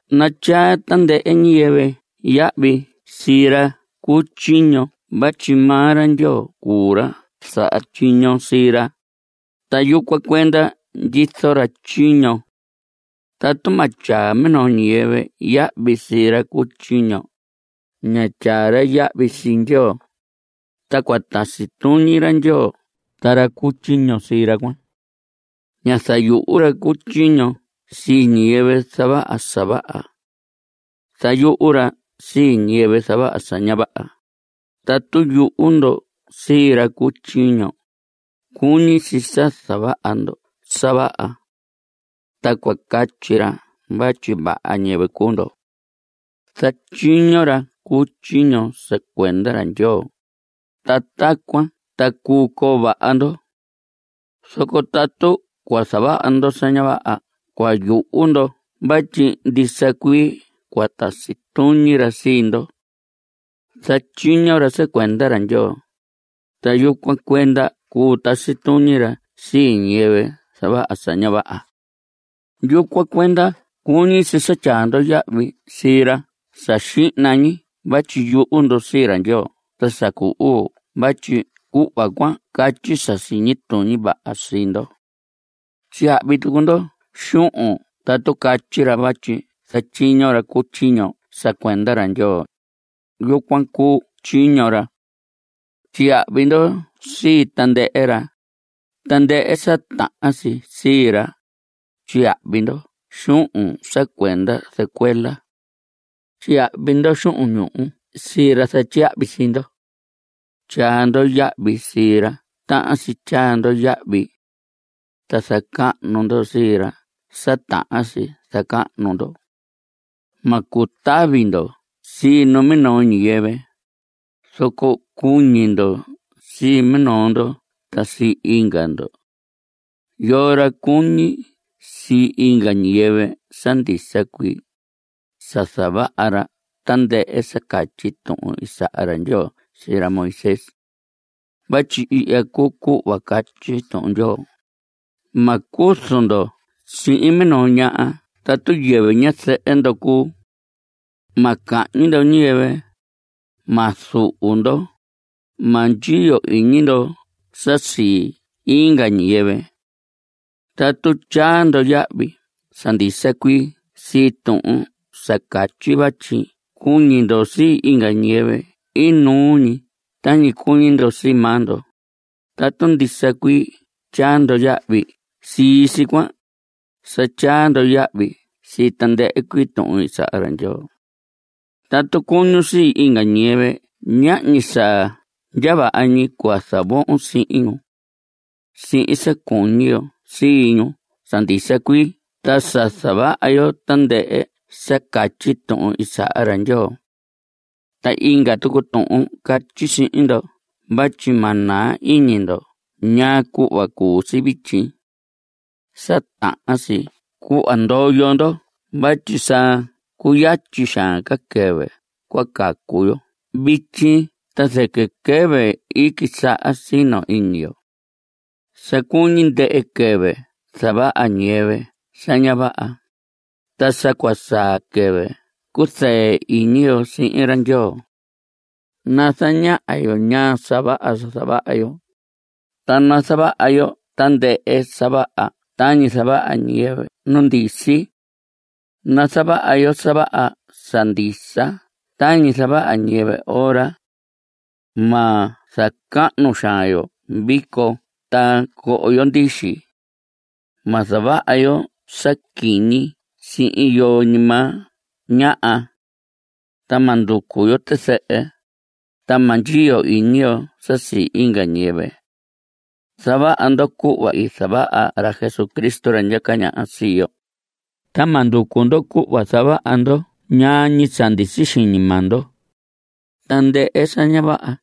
Natyaa tandɨhɨ ñiyɨvɨ yahvi sii ra cu tyiño vatyi maa ra Ndyoo cuu ra saha tyiño sii ra, ta yucuan cuenda ndyizo ra tyiño. Tatu ma tyaa minoo ñiyɨvɨ yahvi sii ra cu tyiño, ña tyaa ra yahvi sii Ndyoo. Ta cua tasi tuñi ra Ndyoo ta ra cu tyiño sii ra cuan. Ña zayuhu ra cu tyiño sii ñiyɨvɨ zavaha sa vaha. Zayuhu ra sii ñiyɨvɨ zavaha sa ña vaha. Tatu yuhu ndo sii ra cu tyiño, cuñi si sa zavaha ndo sa vaha. Ta cua catyi ra vatyi vaha ñiyɨvɨ cuu ndo. Zatyiño ra cu tyiño sa cuenda ra Ndyoo, ta tacuan ta cuu coo vaha ndo. Zoco tatu cua zavaha ndo sa ña vaha cua yuhu ndo vatyi ndisa cuii cua tasi tuñi ra sii ndo. Zatyiño ra sa cuenda ra Ndyoo, ta yucuan cuenda cua tasi tuñi ra sii ñiyɨvɨ zavaha sa ña vaha. Yucuan cuenda cuñi si sa tyaa ndo yahvi sii ra sa xihna ñi vatyi yuhu ndo sii ra Ndyoo ta sa cu uu vatyi cuhva cuan catyi sa siñi tuñi vaha sii ndo. Tyiyahvi tucu ndo xuhun tatu catyi ra, vatyi zatyiño ra cu tyiño sa cuenda ra Ndyoo. Yucuan cuu tyiño ra. Tyiyahvi ndo sii tandɨhɨ ra, tandɨhɨ sa tahan si sii ra. Tyiyahvi ndo xuhun sa cuenda zɨcuela. Tyiyahvi ndo xuhun ñuhu sii ra zatyiyahvi sii ndo. Tyaa ndo yahvi sii ra tahan si tyaa ndo yahvi. Ta zacahnu ndo sii ra sa tahan si zacahnu ndo. Ma cutavi ndo sii numinoo ñiyɨvɨ, zoco cuñi ndo sii minoo ndo ta sii inga ndo. Yoo ra cuñi sii inga ñiyɨvɨ sa ndisa cuii, sa zavaha ra tandɨhɨ sa catyi tuhun i saha ra Ndyoo sii ra Moisés. Vatyi ihya cuu cuhva catyi Tuhun Ndyoo: “Ma cuzu ndo sihin minoo ñaha tatu yɨvɨ ñazɨhɨ ndo cuu. Ma cahñi ndo ñiyɨvɨ. Ma zuhu ndo. Ma ndyiyo iñi ndo sa sii inga ñiyɨvɨ.” Tatu tyaa ndo yahvi sa ndisa cuii sii tuhun sa catyi vatyi cuñi ndo sii inga ñiyɨvɨ inuu ñi tañi cuñi ndo sii maa ndo, tatu ndisa cuii tyaa ndo yahvi sii si cuan, sa tyaa ndo yahvi sii tandɨhɨ cuii tuhun i saha ra Ndyoo. Tatu cuñun sii inga ñiyɨvɨ ñahñi sa ndya vaha ñi cua zavohon sihin ñu. Sihin sa cuñi yo sii ñu sa ndisa cuii ta sa zavaha yo tandɨhɨ sa catyi tuhun i saha ra Ndyoo. Ta inga tucu tuhun catyi sihin ndo vatyi ma naa iñi ndo ñaa cuhva cuu si vityi. Sa tahan si cuhva ndoyo ndo vatyi sa cuyatyi xaan ca quɨvɨ cua cacu yo vityi ta zɨquɨ quɨvɨ i quisaha sino iñi yo. Sa cuñi ndɨhɨ quɨvɨ zavaha ñiyɨvɨ sa ña vaha, ta sa cua saa quɨvɨ cuzɨɨ iñi yo sihin ra Ndyoo. Nazaña yo sa ña vaha sa zavaha yo, ta nazavaha yo tandɨhɨ sa vaha tañi zavaha ñiyɨvɨ nu ndisi. Nazavaha yo sa vaha sa ndisa tañi zavaha ñiyɨvɨ ora. Ma zacahnu xaan yo vico ta coho yo ndixi. Ma zavaha yo sa quiñi sihin yoo ñi maa ñaha. Ta ma nducu yo tizɨhɨ, ta ma ndyiyo iñi yo sa sii inga ñiyɨvɨ. Zavaha ndo cuhva i zavaha ra Jesucristo, ra ndyaca ñaha sii yo. Ta ma nducu ndo cuhva zavaha ndo ñaa ñi sa ndisi xiñi maa ndo, tandɨhɨ sa ña vaha.